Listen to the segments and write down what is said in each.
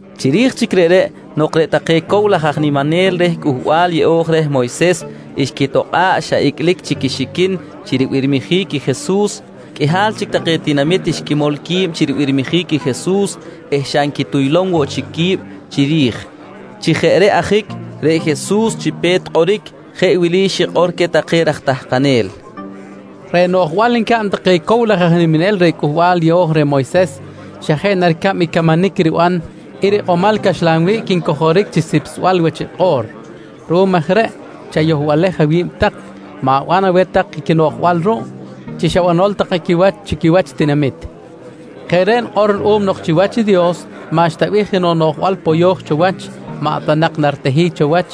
Chiri̱j chic reꞌreꞌ nok reꞌ take cow laj aj niminel reh Cꞌuhbal Yeꞌo̱j reh Moyses xquitokꞌa̱ꞌ xa icꞌlic chic quixiquin chi ribirmijic i Jesus, qꞌuihal chic take tinamit xquimol qui̱b chi ribirmijic i Jesus eh xa nquituylom woꞌ chic qui̱b chiri̱j. Chi jeꞌ reꞌ ajic reꞌ Jesus chi pe̱t kꞌoric jeꞌ wili xikꞌor queh take raj tahkanel: «Reꞌ noꞌjbal ncaꞌn take cow laj aj niminel reh Cꞌuhbal Yeꞌo̱j reh Moyses xa jeꞌ na ricab i camanic riban i rikꞌomal caxlan wiꞌc ncojoric chi sipsbal wach i kꞌo̱r. Ruꞌum aj reꞌ chayohbalej awi̱b tak, ma̱ban aweh tak i quinoꞌjbal ruꞌ chi xa banol take quiwach chi quiwach i tinamit. Jeꞌ reꞌ nikꞌor ruꞌum nok chiwach i Dios maꞌxta bih jenoꞌ noꞌjbal poyo̱j cho wach maꞌ ta nak naritehic cho wach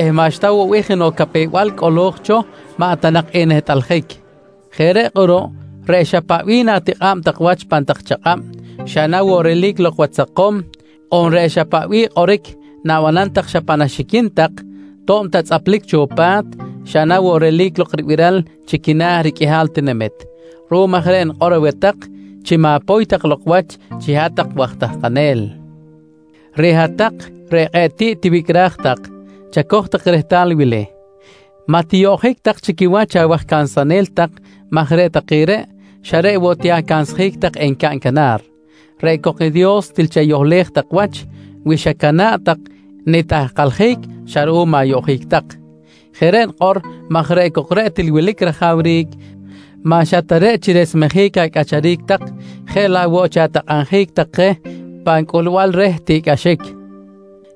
eh maꞌxta woꞌ bih jenoꞌ capew-bal cꞌolo̱j cho maꞌ ta nak enehtꞌaljic. Jeꞌ reꞌ kꞌuruꞌ reꞌ xa paꞌ bih na̱tikꞌa̱b tak wach pan tak chakꞌab xa na woꞌ relic lok wach sakom on reꞌ xa paꞌ bih kꞌoric na̱banam tak xa pan axiquin tak to̱b ta tzꞌaplic cho pa̱t, xa na woꞌ relic lok ribiral chi quina̱ riqꞌuihal tinamit. Ruꞌum aj reꞌ nikꞌor aweh tak chi ma̱poy tak lok wach chi hat-tak waj tahkanel. «Reꞌ hat-tak reꞌ kꞌe̱ꞌ tiꞌ tiwicꞌraj tak, chacoj tak rehtal i wili: Maꞌ tiyoꞌjic tak chi quiwach awaj cansanel tak maj reꞌ take reꞌ xa reꞌ woꞌ ti acansjic tak encaꞌn canar. Reꞌ cok i Dios til chayohlej tak wach wi xacana̱ꞌ tak nitahkaljic xa ruꞌum ayoꞌjic tak. Jeꞌ reꞌ nikꞌor maj reꞌ cok reꞌ til wilic rajawric maꞌ xa ta reꞌ chi resmejic acꞌacharic tak jeꞌ laꞌ woꞌ chi atakꞌabjic tak je pan cꞌulbal reh tiꞌcꞌaxic.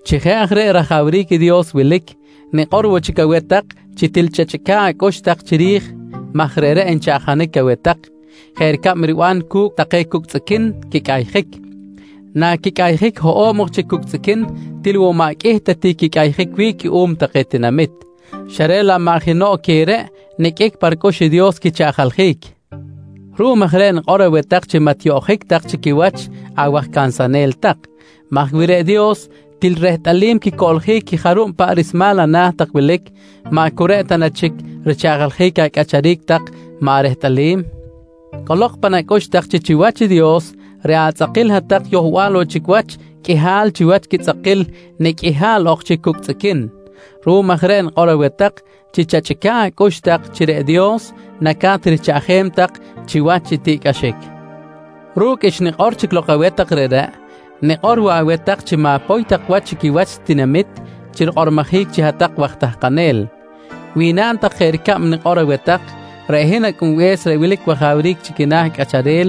«Chi jeꞌ aj reꞌ i rajawric i Dios wilic, nikꞌor woꞌ chic aweh tak chi til chachꞌica̱ꞌ acꞌux tak chiri̱j maj reꞌreꞌ nchaꞌjanic aweh tak jeꞌ ricab riban cu̱cꞌ take cucꞌ tzꞌiquin quicꞌayjic. Naquicꞌayjic hoꞌo̱b ok chi cucꞌ tzꞌiquin, til woꞌ maꞌ qꞌuih ta ti quicꞌayjic wi̱ꞌ cuꞌum take tinamit, xa reꞌ laꞌ maꞌ jenoꞌ queh reꞌ niqꞌuic ta nak pa ricꞌux i Dios quichaꞌjaljic. Ruꞌum aj reꞌ nikꞌor aweh tak chi maꞌ tiyoꞌjic tak chi quiwach awaj cansanel tak maj wi reꞌ Dios til rehtꞌalim quicꞌoloric i jarub paꞌ rismal ana̱ tak wilic, maꞌ cu reꞌ ta na chic richaꞌjaljic acꞌacharic tak maꞌ rehtꞌalim? Cꞌolok pan acꞌux tak chi chiwach i Dios, reꞌ atzꞌakil hat-tak yohbal woꞌ chic wach qꞌuihal chiwach quitzꞌakil nicꞌ qꞌuihal ok chi cucꞌ tzꞌiquin. Ruꞌum aj reꞌ nikꞌor aweh tak chi chachꞌica̱ꞌ acꞌux tak chi reꞌ Dios naca̱t richaꞌjem tak chiwach i tiꞌcꞌaxic. «Ru̱cꞌ xnikꞌor chic lok aweh tak reꞌreꞌ, nikꞌor woꞌ aweh tak chi ma̱poy tak wach chi quiwach i tinamit chi rikꞌormojic chi hat-tak waj tahkanel. Wi naꞌn tak jeꞌ ricab nikꞌor aweh tak, reꞌ hin Acꞌunbe̱s reꞌ wilic wajawric chi quina̱ cꞌacharel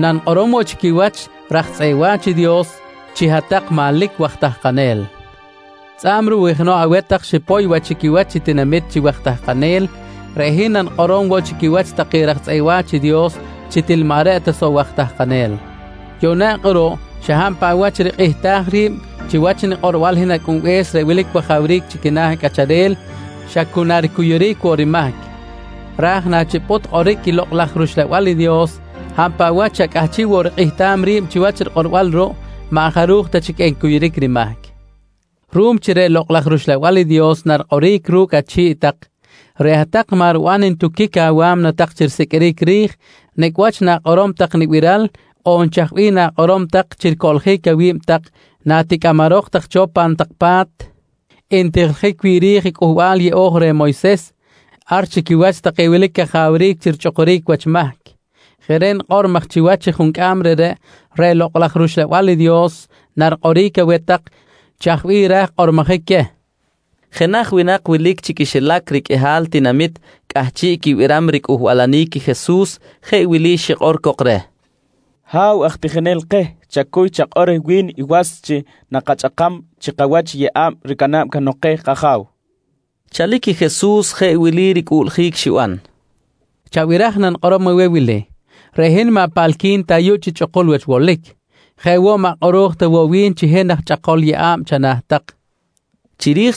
nanikꞌorom woꞌ chi quiwach raj tzꞌeꞌ wa̱ch i Dios chi hat-tak manlic waj tahkanel. Tzꞌa̱b ruꞌ wi jenoꞌ aweh tak xipoy wach chi quiwach i tinamit chi waj tahkanel, reꞌ hin nanikꞌorom woꞌ chi quiwach take raj tzꞌeꞌ wa̱ch i Dios chi til maꞌ reꞌ ta soꞌ waj tahkanel. «Yuꞌna kꞌuruꞌ xa hab paꞌ wach rikꞌihtaj ri̱b chiwach nikꞌorbal hin Acꞌunbe̱s reꞌ wilic wajawric chi quina̱ cꞌacharel xa cu na ricuyuric woꞌ rimahc, raj nachipꞌut kꞌoric i Lokꞌ laj rUxlabal i Dios hab paꞌ wach xa cꞌahchiꞌ woꞌ rikꞌehtam ri̱b chiwach rikꞌorbal ruꞌ, maꞌ jaruj ta chic encuyuric rimahc. Ruꞌum chi reꞌ Lokꞌ laj rUxlabal i Dios narikꞌoric ru̱cꞌ achi̱ꞌ tak, reꞌ hat-tak maꞌ riban ntuquic awa̱mna tak chi risiqꞌuiric ri̱j nicꞌ wach na̱kꞌorom tak nibiral on chaj bih na̱kꞌorom tak chi ricoꞌljic awi̱b tak naticꞌamarok tak cho pan tak pa̱t ntijiljic wi̱ꞌ ri̱j Cꞌuhbal Yeꞌo̱j reh Moyses ar chi quiwach take wilic cajawric chi richꞌukuric wach mahc. Jeꞌ reꞌ nikꞌor maj chiwach i juncꞌam reꞌreꞌ, reꞌ Lokꞌ laj rUxlabal i Dios narikꞌoric aweh tak chaj bih raj kꞌormojic queh, nqui Jesus queh. Jenaj winak wilic chi quixilac riqꞌuihal tinamit cꞌahchiꞌ quibiram ricꞌuhbalanic i Jesus jeꞌ wili xikꞌor cok reh: «Ha̱w aj tijinel keh, chacuy chakꞌor reh wi̱n i was chi nakachꞌakam chi kawach i yeꞌa̱b ricana̱b cahnok keh i kaja̱w, nqui reh. Chalic i Jesus jeꞌ wili ricꞌuꞌljic xiban: «Chabiraj nanikꞌorom aweh wili: Reꞌ hin maꞌ paꞌalqui̱n ta ayuꞌ chi chꞌukul wach wolic. Jeꞌ woꞌ, maꞌ kꞌoro̱j ta woꞌ wi̱n chi hin aj chꞌakol yeꞌa̱b chana̱ tak, nqui reh.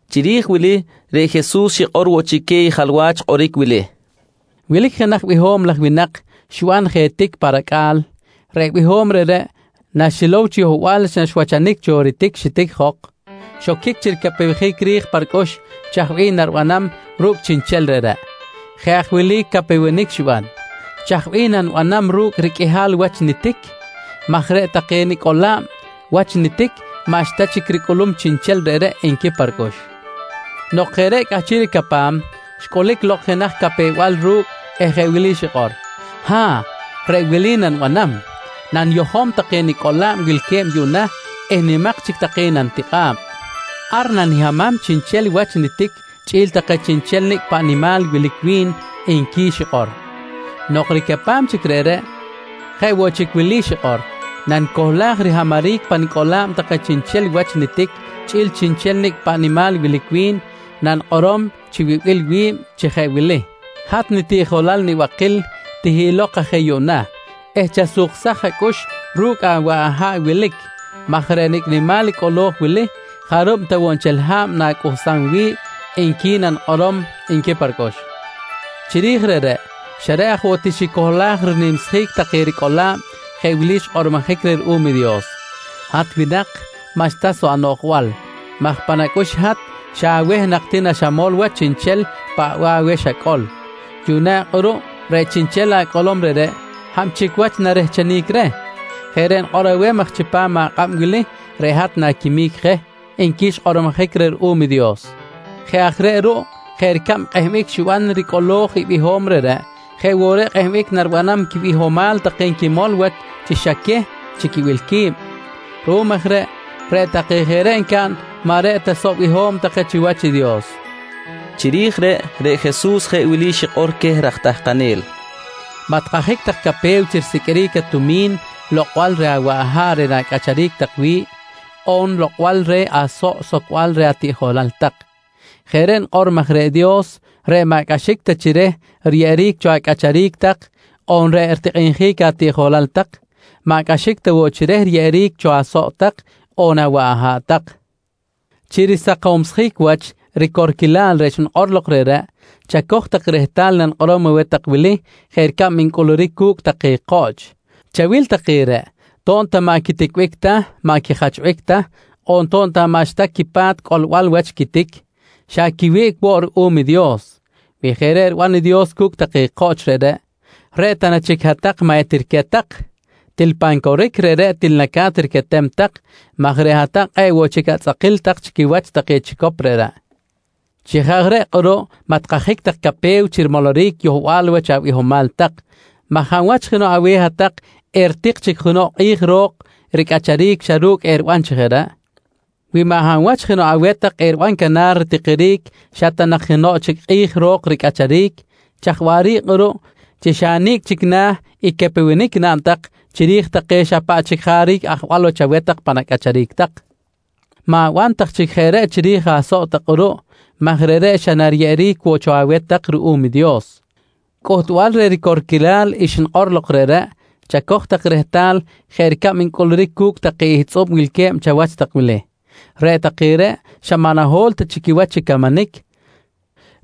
Chiri̱j wili reꞌ Jesus xikꞌor woꞌ chic queh i jalwach kꞌoric wili: «Wilic jenaj biho̱m laj winak xiban je tic pa racꞌa̱l. Reꞌ biho̱m reꞌreꞌ naxilow chi yohbal wach naxwachanic cho i ritic xitic jok, xoquic chi ricapewjic ri̱j pa ricꞌux chaj bih naribanam ru̱cꞌ chiꞌnchel reꞌreꞌ. Jeꞌ aj wili capewenic xiban: ‹Chaj bih nanibanam ru̱cꞌ riqꞌuihal wach nitic? maj reꞌ take nicꞌola̱b wach nitic maꞌxta chic ricꞌulum chiꞌnchel reꞌreꞌ, nqui pa ricꞌux. «Nok jeꞌ reꞌ cꞌahchiꞌ ricapam, xcꞌulic lok jenaj capew-bal ru̱cꞌ eh jeꞌ wili xikꞌor: ‹Ha̱ꞌ, reꞌ wili nanibanam: Naniyojom take nicꞌola̱b wilque̱b yuꞌna eh nimak chic take nanitikꞌa̱b. Ar nanihamam chiꞌnchel wach i nitic chꞌi̱l take chiꞌnchel nicꞌ paꞌ nimal wilic wi̱n, nqui xikꞌor. «Nok ricapam chic reꞌreꞌ, jeꞌ woꞌ chic wili xikꞌor: ‹Nanicohlaj rihamaric pa nicꞌola̱b take chiꞌnchel wach i nitic chꞌi̱l chiꞌnchel nicꞌ paꞌ nimal wilic wi̱n, nanikꞌorom chi wibil wi̱b chi jeꞌ wili: ‹Hat nitiꞌjolal nibakil, tihiꞌlok aj je yuꞌna eh chasuksaj acꞌux ru̱cꞌ awaꞌ aha̱ꞌ wilic maj reꞌ nicꞌ nimal i cꞌolo̱j wili, jarub ta woꞌ nchel ha̱b na̱cꞌuhsam wi̱ꞌ, nqui nanikꞌorom, nqui pa ricꞌux. «Chiri̱j reꞌreꞌ, xa reꞌ aj woꞌ ti xicohlaj rinimsjic take ricꞌola̱b jeꞌ wili xkꞌormojic reh ruꞌum i Dios: ‹Hat winak, maꞌxta soꞌ anoꞌjbal maj pan acꞌux i hat xa aweh nak ti naxamol wach i chiꞌnchel paꞌ bih aweh xacꞌol. Yuꞌna kꞌuruꞌ reꞌ chiꞌnchel acꞌolom reꞌreꞌ, hab chic wach narehchenic reh? Jeꞌ reꞌ nikꞌor aweh maj chipam akꞌab wili reꞌ hat na̱quimic je, nqui xkꞌormojic reh ruꞌum i Dios. «Jeꞌ aj reꞌ ruꞌ jeꞌ ricab kꞌehbic xiban ricꞌolo̱j i biho̱m reꞌreꞌ, jeꞌ woꞌ reꞌ kꞌehbic naribanam quibihomal take nquimol wach chi xa queh chi quibil qui̱b. Ruꞌum aj reꞌ, reꞌ take jeꞌ reꞌ ncaꞌn maꞌ reꞌ ta soꞌ biho̱m take chiwach i Dios, nqui Jesus. Chiri̱j reꞌ, reꞌ Jesus jeꞌ wili xikꞌor queh raj tahkanel: «Maꞌ tikajic tak capew chi risiqꞌuiric atumi̱n lokꞌbal reh awaꞌ aha̱ꞌ reꞌ na̱cꞌacharic tak wi̱ꞌ on lokꞌbal reh asoꞌ socbal reh atiꞌjolal tak. Jeꞌ reꞌ nikꞌor maj reꞌ Dios reꞌ maꞌ cꞌaxic ta chi reh riyeꞌeric cho acꞌacharic tak on reꞌ ritikꞌinjic atiꞌjolal tak, maꞌ cꞌaxic ta woꞌ chi reh riyeꞌeric cho asoꞌ tak on awaꞌ aha̱ꞌ tak. Chi risakomsjic wach i ricorquilal reꞌ xnikꞌor lok reꞌreꞌ, chacoj tak rehtal i nanikꞌorom aweh tak wili jeꞌ ricab ncꞌuluric cu̱cꞌ take koꞌch: Chawil take reꞌ, to̱b ta maꞌ quiticbic ta, maꞌ quijachbic ta on to̱b ta maꞌxta woꞌ quipa̱t cꞌolbal wach i quitic, xa quiwiꞌc woꞌ ruꞌum i Dios. Wi jeꞌ reꞌ riban i Dios cu̱cꞌ take koꞌch reꞌreꞌ, reꞌ ta na chic hat-tak maꞌ etiriquet tak? Til pan coric, reꞌreꞌ til naca̱t riquetem tak maj reꞌ hat-tak kꞌe̱ꞌ woꞌ chic atzꞌakil tak chi quiwach take chicop reꞌreꞌ. «Chi jeꞌ aj reꞌ kꞌuruꞌ maꞌ tikajic tak capew chi rimoloric yohbal wach abihomal tak maj hab wach jenoꞌ aweh hat-tak eritik chic jenoꞌ kꞌi̱j ro̱k ricꞌacharic xa ru̱cꞌ eriban chi jeꞌ reꞌ? Wi maꞌ hab wach jenoꞌ aweh tak eriban canar ritikiric xa ta nak jenoꞌ chic kꞌi̱j ro̱k ricꞌacharic, chaj waꞌric kꞌuruꞌ chi xa nicꞌ chic na̱ i capewenic naꞌn tak chiri̱j take xa paꞌ chic jaric ajwal wach aweh tak pan acꞌacharic tak? Ma̱ban tak chic jeꞌ reꞌ chiri̱j asoꞌ tak kꞌuruꞌ maj reꞌreꞌ xa nariyeꞌeric woꞌ cho aweh tak ruꞌum i Dios. Cꞌuhtbal reh ricorquilal xnikꞌor lok reꞌreꞌ chacoj tak rehtal jeꞌ ricab ncꞌuluric cu̱cꞌ take ihtzꞌub wilque̱b chawach tak wili: Reꞌ take reꞌ xa maꞌ naho̱l ta chic quiwach chi camanic,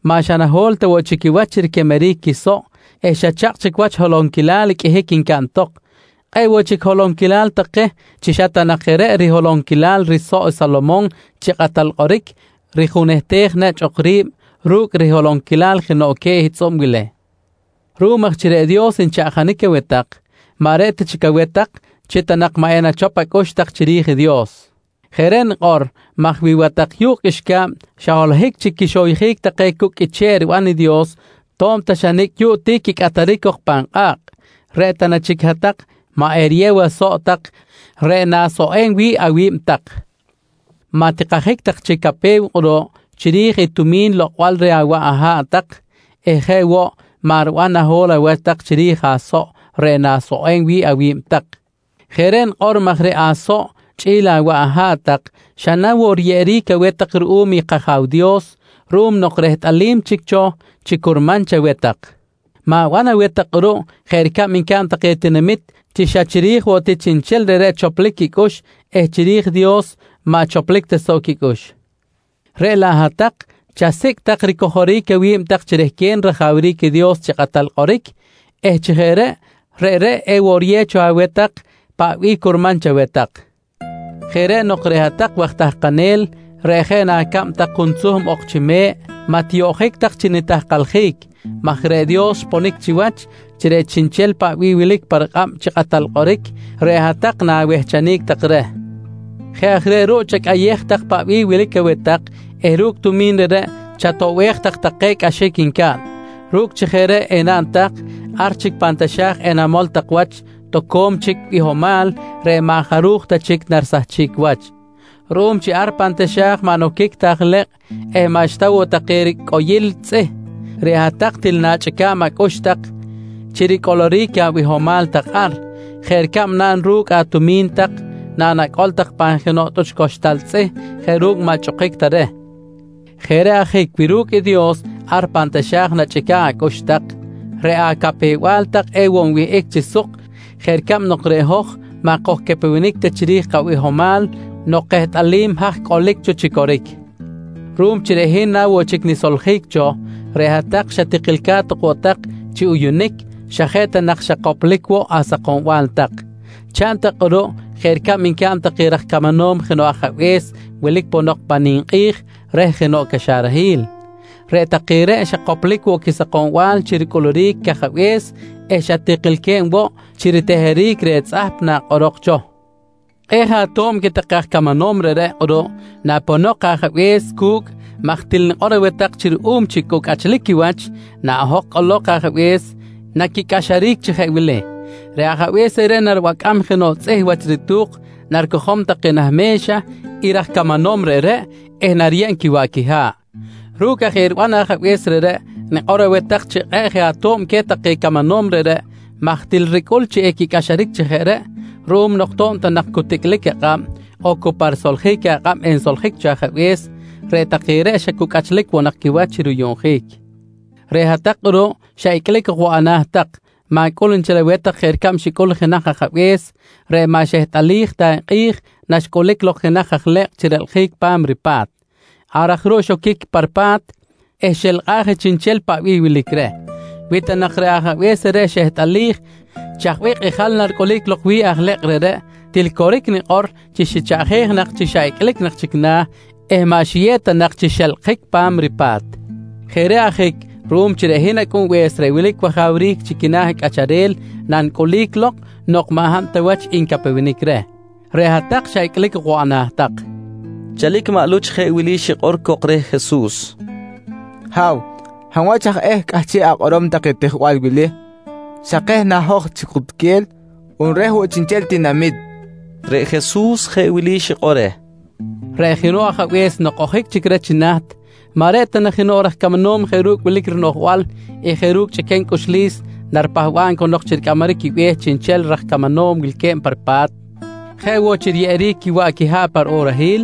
maꞌ xa naho̱l ta woꞌ chic quiwach chi riquemeric quisoꞌ eh xa chakꞌ chic wach holonquilal qꞌuihic ncaꞌn tok. Kꞌe̱ꞌ woꞌ chic holonquilal take chi xa ta nak je reꞌ riholonquilal risoꞌ i Salomon chi kꞌatal kꞌoric rijunehtej nechꞌ ok ri̱b ru̱cꞌ riholonquilal jenoꞌ queh ihtzꞌub wili! «Ruꞌum aj chi reꞌ Dios nchaꞌjanic aweh tak, maꞌ reꞌ ta chic aweh tak chi maꞌ ta nak enachop acꞌux tak chiri̱j i Dios. Jeꞌ reꞌ nikꞌor maj wi watak yu̱kꞌ qꞌuixca̱b xa holohic chic rixoyjic take cu̱cꞌ qꞌuiche̱ꞌ riban i Dios to̱b ta xa nicꞌ yuꞌ ti quicꞌataric cok pan kꞌa̱kꞌ, reꞌ ta na chic hat-tak maꞌ eriyew asoꞌ tak reꞌ na̱soꞌem wi̱ꞌ awi̱b tak? Maꞌ tikajic tak chic capew kꞌuruꞌ chiri̱j i tumi̱n lokꞌbal reh awaꞌ aha̱ꞌ tak eh jeꞌ woꞌ maꞌ riban naho̱l awach tak chiri̱j asoꞌ reꞌ na̱soꞌem wi̱ꞌ awi̱b tak. Jeꞌ reꞌ nikꞌor maj reꞌ asoꞌ chꞌi̱l awaꞌ aha̱ꞌ tak, xa na woꞌ riyeꞌeric aweh tak ruꞌum i kAja̱w Dios ruꞌum nok rehtꞌalim chic cho chi curman chaweh tak. Ma̱ban aweh tak kꞌuruꞌ jeꞌ ricab ncaꞌn take tinamit chi xa chiri̱j woꞌ chiꞌnchel reꞌreꞌ choplic quicꞌux eh chiri̱j i Dios maꞌ choplic ta soꞌ quicꞌux. Reꞌ laꞌ hat-tak chasicꞌ tak ricojoric awi̱b tak chi rehquen rajawric i Dios chi kꞌatal kꞌoric eh chi jeꞌ reꞌ, reꞌreꞌ ewoꞌ riyew cho aweh tak i paꞌ bih curman chaweh tak. «Jeꞌ reꞌ nok reꞌ hat-tak waj tahkanel reꞌ jeꞌ na acab tak juntzuhm ok ti chi me̱ꞌ maꞌ tiyoꞌjic tak chi nitahkaljic maj reꞌ Dios xponic chiwach chi reꞌ chiꞌnchel paꞌ bih wilic pa rikꞌab chi kꞌatal kꞌoric reꞌ hat-tak na̱wehchenic tak reh. Jeꞌ aj reꞌ ruꞌ chacꞌayej tak paꞌ bih wilic aweh tak eh ru̱cꞌ tumi̱n reꞌreꞌ chatoꞌbej tak take cꞌaxic ncaꞌn. Ru̱cꞌ chi jeꞌ reꞌ enaꞌn tak, ar chic pan taxa̱j enamol tak wach toco̱m chic bihomal reꞌ maꞌ jaruj ta chic narisahchic wach. Ruꞌum chi ar pan taxa̱j maꞌ noquic ta aj ilekꞌ eh maꞌxta woꞌ take ricꞌoyil tzꞌih, reꞌ hat-tak til na̱chꞌica̱b acꞌux tak chi ricꞌoloric abihomal tak ar jeꞌ ricab naꞌn ru̱cꞌ atumi̱n tak nanacꞌol tak pan jenoꞌ tꞌuch coxtal tzꞌih jeꞌ ru̱cꞌ maꞌ chꞌukic ta reh. Jeꞌ reꞌ ajic wi ru̱cꞌ i Dios ar pan taxa̱j nachꞌica̱ꞌ acꞌux tak, reꞌ acapew-bal tak ewoꞌ nwihꞌic chi suk jeꞌ ricab nok reꞌ hoj maꞌ kojcapewenic chiri̱j kabihomal nok kehtꞌalim haj cꞌolic cho chi coric. «Ruꞌum chi reꞌ hin na woꞌ chic nisoljic cho, reꞌ hat-tak xa tikilca̱t ok woꞌ tak chi uyuꞌunic xa jeꞌ ta nak xa koplic woꞌ asakombal tak. Chaꞌn tak kꞌuruꞌ jeꞌ ricab ncaꞌn take raj camanom jenoꞌ ajabe̱s wilic ponok pan ninkꞌi̱j reh jenoꞌ caxarahil. Reꞌ take reꞌ xa koplic woꞌ quisakombal chi ricꞌuluric i cajabe̱s eh xa tikilque̱b woꞌ chi riteheric reh tzꞌahp nakꞌorok cho. Kꞌe̱ꞌ je ato̱b queh take aj camanom reꞌreꞌ kꞌuruꞌ naponok i ajabe̱s cu̱cꞌ maj til nikꞌor aweh tak chi ruꞌum chi cu cꞌachlic quiwach naꞌojok cꞌolok i ajabe̱s, naquicꞌaxaric chi jeꞌ wili: Reꞌ ajabe̱s reꞌreꞌ naribacꞌam jenoꞌ tzꞌih wach ritu̱k, naricojom take nah me̱xa i raj camanom reꞌreꞌ eh nariyeb quiwaꞌ quiha̱ꞌ. Ru̱cꞌ aj eriban ajabe̱s reꞌreꞌ, nikꞌor aweh tak chi kꞌe̱ꞌ je ato̱b queh take camanom reꞌreꞌ maj til ricꞌul chi equicꞌaxaric chi jeꞌ reꞌ ruꞌum nok to̱b ta nak cu ticꞌlic akꞌab on cu pa risoljic akꞌab ensoljic cho ajabe̱s, reꞌ take reꞌ xa cu cꞌachlic woꞌ nak quiwach chi ruyuꞌnjic. «Reꞌ hat-tak kꞌuruꞌ xa icꞌlic ok woꞌ ana̱ tak. Ma̱cꞌul nchel aweh tak jeꞌ ricab xicꞌul i jenaj ajabe̱s reꞌ maꞌ xehtꞌalij ta i kꞌi̱j naxcꞌulic lok jenaj aj lekꞌ chi relkꞌjic pa̱m ripa̱t. Ar aj ruꞌ xoquic pa ripa̱t eh xelkꞌaj je chiꞌnchel paꞌ bih wilic reh. Wi ta nak reꞌ ajabe̱s reꞌreꞌ xehtꞌalij chaj bih kꞌijal naricꞌulic lok wi̱ꞌ aj lekꞌ reꞌreꞌ, til coric nikꞌor chi xichaꞌjej nak chi xa icꞌlic chic na̱ eh maꞌ xiyew ta nak chi xelkꞌjic pa̱m ripa̱t. Jeꞌ reꞌ ajic ruꞌum chi reꞌ hin Acꞌunbe̱s reꞌ wilic wajawric chi quina̱ cꞌacharel nanicꞌulic lok nok maꞌ hab ta wach ncapewenic reh, reꞌ hat-tak xa icꞌlic ok woꞌ ana̱ tak, nqui Jesus. Chalic maꞌ Luch jeꞌ wili xikꞌor cok reh Jesus: «Ha̱w, hab wach aj eh cꞌahchiꞌ akꞌorom take tijbal wili? Xa keh na hoj chi kutquel on reh woꞌ chiꞌnchel tinamit? nqui cok reh. Reꞌ Jesus jeꞌ wili xikꞌor reh: «Reꞌ jenoꞌ ajabe̱s nok ojic chic reh chi naht, maꞌ reꞌ ta na jenoꞌ raj camanom jeꞌ ru̱cꞌ wilic rinoꞌjbal eh jeꞌ ru̱cꞌ chꞌiquem cꞌuxlis naripahba̱b cahnok chi ricꞌamaric quibe̱h chiꞌnchel raj camanom wilque̱b pa ripa̱t jeꞌ woꞌ chi riyeꞌeric quiwaꞌ quiha̱ꞌ pa riꞌorahil?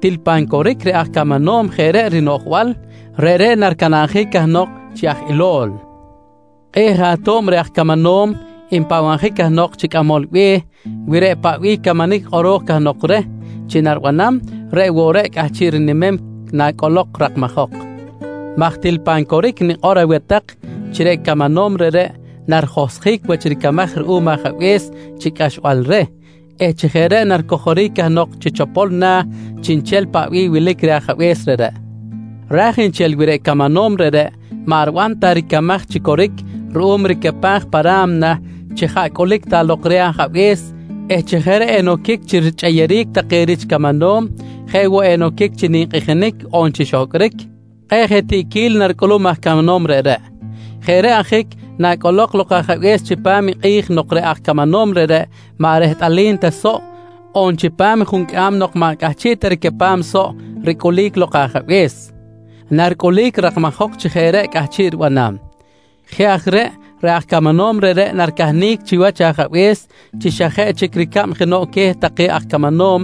Til pan coric reꞌ aj camanom reꞌ jeꞌ reꞌ rinoꞌjbal, reꞌreꞌ naricanabjic cahnok chi aj ilo̱l. Kꞌe̱ꞌ je ato̱b reh aj camanom npahbabjic cahnok chi cꞌamol be̱h, wi reꞌ paꞌ bih i camanic kꞌoro̱j cahnok reh chi naribanam, reꞌ woꞌ reꞌ cꞌahchiꞌ rinimem nacꞌolok rakmajok maj til pan coric nikꞌor aweh tak chi reꞌ camanom reꞌreꞌ narijohsjic wach ricamaj ruꞌum ajabe̱s chi cꞌaxbal reh eh chi jeꞌ reꞌ naricojoric cahnok chi chopol na̱ chiꞌnchel paꞌ bih wilic reh i ajabe̱s reꞌreꞌ. Ra̱j nchel wi reꞌ camanom reꞌreꞌ maꞌ riban ta ricamaj chi coric ruꞌum ricapaj pa ra̱mna chi jaꞌ cꞌulic ta lok reh ajabe̱s eh chi jeꞌ reꞌ enoquic chi quichꞌeyeric take rich camanom jeꞌ woꞌ enoquic chi ninkꞌijinic on chi xohcꞌric, kꞌe̱ꞌ je tiꞌquil naricꞌulum aj camanom reꞌreꞌ. Jeꞌ reꞌ ajic nacꞌolok lok i ajabe̱s chipam i kꞌi̱j nok reꞌ aj camanom reꞌreꞌ maꞌ rehtꞌalim ta soꞌ on chipam i juncꞌam nok maꞌ cꞌahchiꞌ ta ricapam soꞌ ricꞌulic lok i ajabe̱s, naricꞌulic rakmajok chi jeꞌ reꞌ cꞌahchiꞌ ribanam. Jeꞌ aj reꞌ, reꞌ aj camanom reꞌreꞌ naricahnic chiwach i ajabe̱s chi xa jeꞌ chic ricab jenoꞌ queh take aj camanom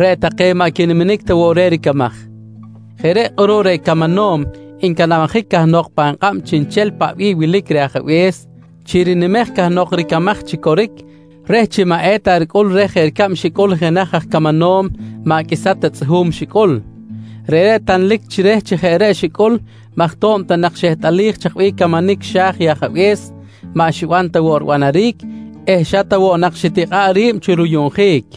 reꞌ take maꞌ quiniminic ta woꞌ reh ricamaj. Jeꞌ reꞌ kꞌuruꞌ reꞌ camanom ncanabjic cahnok pan kꞌab chiꞌnchel paꞌ bih wilic reh ajabe̱s, chi rinimej cahnok ricamaj chi coric reh chi maꞌ eta ricꞌul reh jeꞌ ricab xicꞌul jenaj aj camanom maꞌ qꞌuisa ta tzꞌuhu̱m xicꞌul. Reꞌreꞌ tanlic chi reh chi jeꞌ reꞌ xicꞌul maj to̱b ta nak xehtꞌalij chaj bih camanic xa̱j i ajabe̱s, maꞌ xiban ta woꞌ ribanaric eh xa ta woꞌ nak xitikꞌa̱ꞌ ri̱b chi ruyuꞌnjic.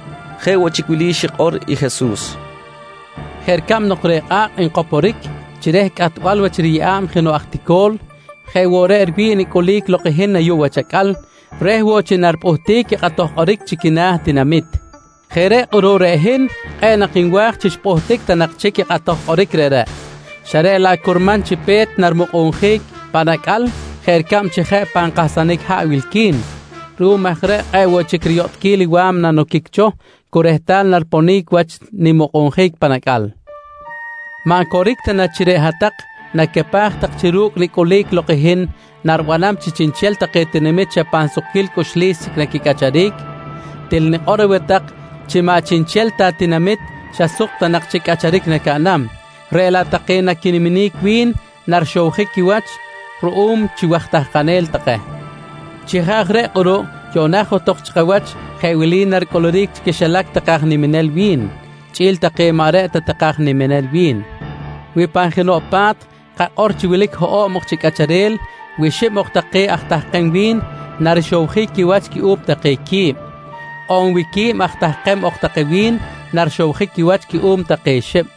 Chiri̱j chi reꞌ jeꞌ woꞌ chic wili xikꞌor i Jesus: «Jeꞌ ricab nok reꞌ kꞌa̱kꞌ nkoporic chi reh cꞌatbal wach riyeꞌa̱b jenoꞌ aj tico̱l, jeꞌ woꞌ reꞌ riwi̱ꞌ i nicꞌulic lok i hin ayuꞌ wach acꞌal, reh woꞌ chi naripꞌuhtic i kꞌatoj kꞌoric chi quina̱ tinamit. Jeꞌ reꞌ kꞌuruꞌ reꞌ hin kꞌe̱ꞌ nak nwa̱j chi xpꞌuhtic ta nak chic i kꞌatoj kꞌoric reꞌreꞌ, xa reꞌ laꞌ curman chi pe̱t nanimukꞌunjic pan acꞌal jeꞌ ricab chi jeꞌ pan kahsanic haꞌ wilqui̱n. Ruꞌum aj reꞌ kꞌe̱ꞌ woꞌ chic riyotꞌquil i wa̱mna noquic cho cu rehtal nariponic wach nimukꞌunjic pan acꞌal. «Maꞌ coric ta na chi reꞌ hat-tak nacapaj tak chi ru̱cꞌ nicꞌulic lok i hin, naribanam chi chiꞌnchel take tinamit xa pan sukquil cꞌuxlis chic naquicꞌacharic? Til nikꞌor aweh tak chi maꞌ chiꞌnchel ta tinamit xa suk ta nak chic cꞌacharic nacaꞌnam, reꞌ laꞌ take naquiniminic wi̱n narixowjic quiwach ruꞌum chi waj tahkanel take. Chi jeꞌ aj reꞌ kꞌuruꞌ yuꞌna johtok chi kawach jeꞌ wili naricꞌuluric chi quixilac take aj niminel wi̱n chꞌi̱l take maꞌ reꞌ ta take aj niminel wi̱n: Wi pan jenoꞌ pa̱t, kakꞌor chi wilic hoꞌo̱b ok chi cꞌacharel, wi xib ok take aj tahkem wi̱n, narixowjic quiwach cuꞌum take qui̱b. On wi reꞌ quib aj tahkem ok take wi̱n, narixowjic quiwach cuꞌum take xib.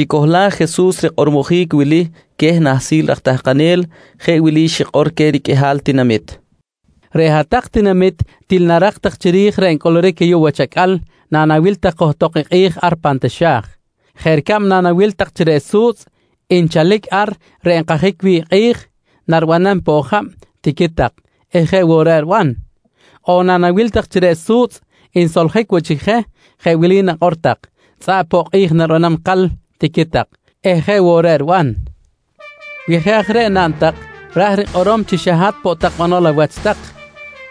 Naxicohlaj Jesus rikꞌormojic wili queh nahsil raj tahkanel, jeꞌ wili xikꞌor queh riqꞌuihal tinamit: «Reꞌ hat-tak tinamit til narak tak chiri̱j reꞌ ncꞌuluric ayuꞌ wach acꞌal nanawil tak johtok i kꞌi̱j ar pan taxa̱j. Jeꞌ ricab nanawil tak chi reꞌ su̱tzꞌ nchalic ar reꞌ nkajic wi̱ꞌ i kꞌi̱j, naribanam poꞌ jab, tiqui tak eh jeꞌ woꞌ reꞌ riban. On nanawil tak chi reꞌ su̱tzꞌ nsoljic woꞌ chic je, jeꞌ wili nakꞌor tak: ‹Tzꞌaꞌ poꞌ kꞌi̱j naribanam ikal, tiqui tak eh jeꞌ woꞌ reꞌ riban. «Wi jeꞌ aj reꞌ naꞌn tak, ra̱j rikꞌorom chi xa hat poꞌ banol awach tak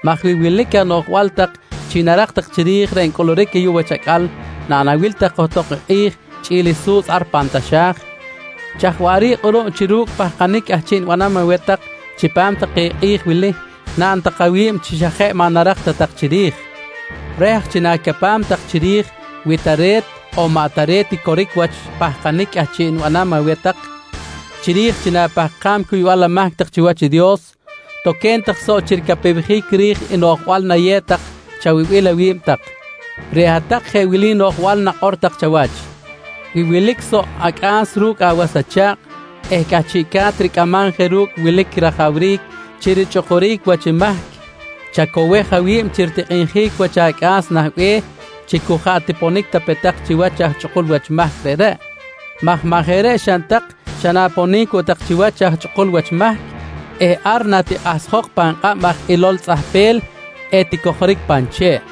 maj wi wilic aj anoꞌjbal tak chi narak tak chiri̱j reꞌ ncꞌuluric ayuꞌ wach acꞌal nanawil tak johtok i kꞌi̱j chꞌi̱l i su̱tzꞌ ar pan taxa̱j, chaj waꞌric kꞌuruꞌ chi ru̱cꞌ pahkanic cꞌahchiꞌ nibanam aweh tak chipam take kꞌi̱j wili naꞌn tak awi̱b chi xa jeꞌ maꞌ narak ta tak chiri̱j? «Reh aj chi na̱capam tak chiri̱j wi tare̱t on maꞌ tare̱t i coric wach i pahkanic cꞌahchiꞌ nibanam aweh tak chiri̱j chi na̱pahkam cuybal amahc tak chiwach i Dios, toque̱n tak soꞌ chi ricapewjic ri̱j i noꞌjbal nayew tak chawibil awi̱b tak. Reꞌ hat-tak jeꞌ wili noꞌjbal nakꞌor tak chawach: ‹Wi wilic soꞌ acꞌa̱s ru̱cꞌ awas acha̱kꞌ eh cꞌahchiꞌca̱t ricꞌamam je ru̱cꞌ i wilic rajawric chi richꞌukuric wach mahc, chacowej awi̱b chi ritikꞌinjic wach acꞌa̱s nah be̱h chi cu jaꞌ tiponic ta pe tak chiwach aj chꞌukul wach mahc reꞌreꞌ maj maꞌ jeꞌ reꞌ xaꞌn tak, xa na̱ponic woꞌ tak chiwach aj chꞌukul wach mahc eh ar natikꞌahsjok pan kꞌab aj ilol tzꞌahpel eticojoric pan che̱ꞌ.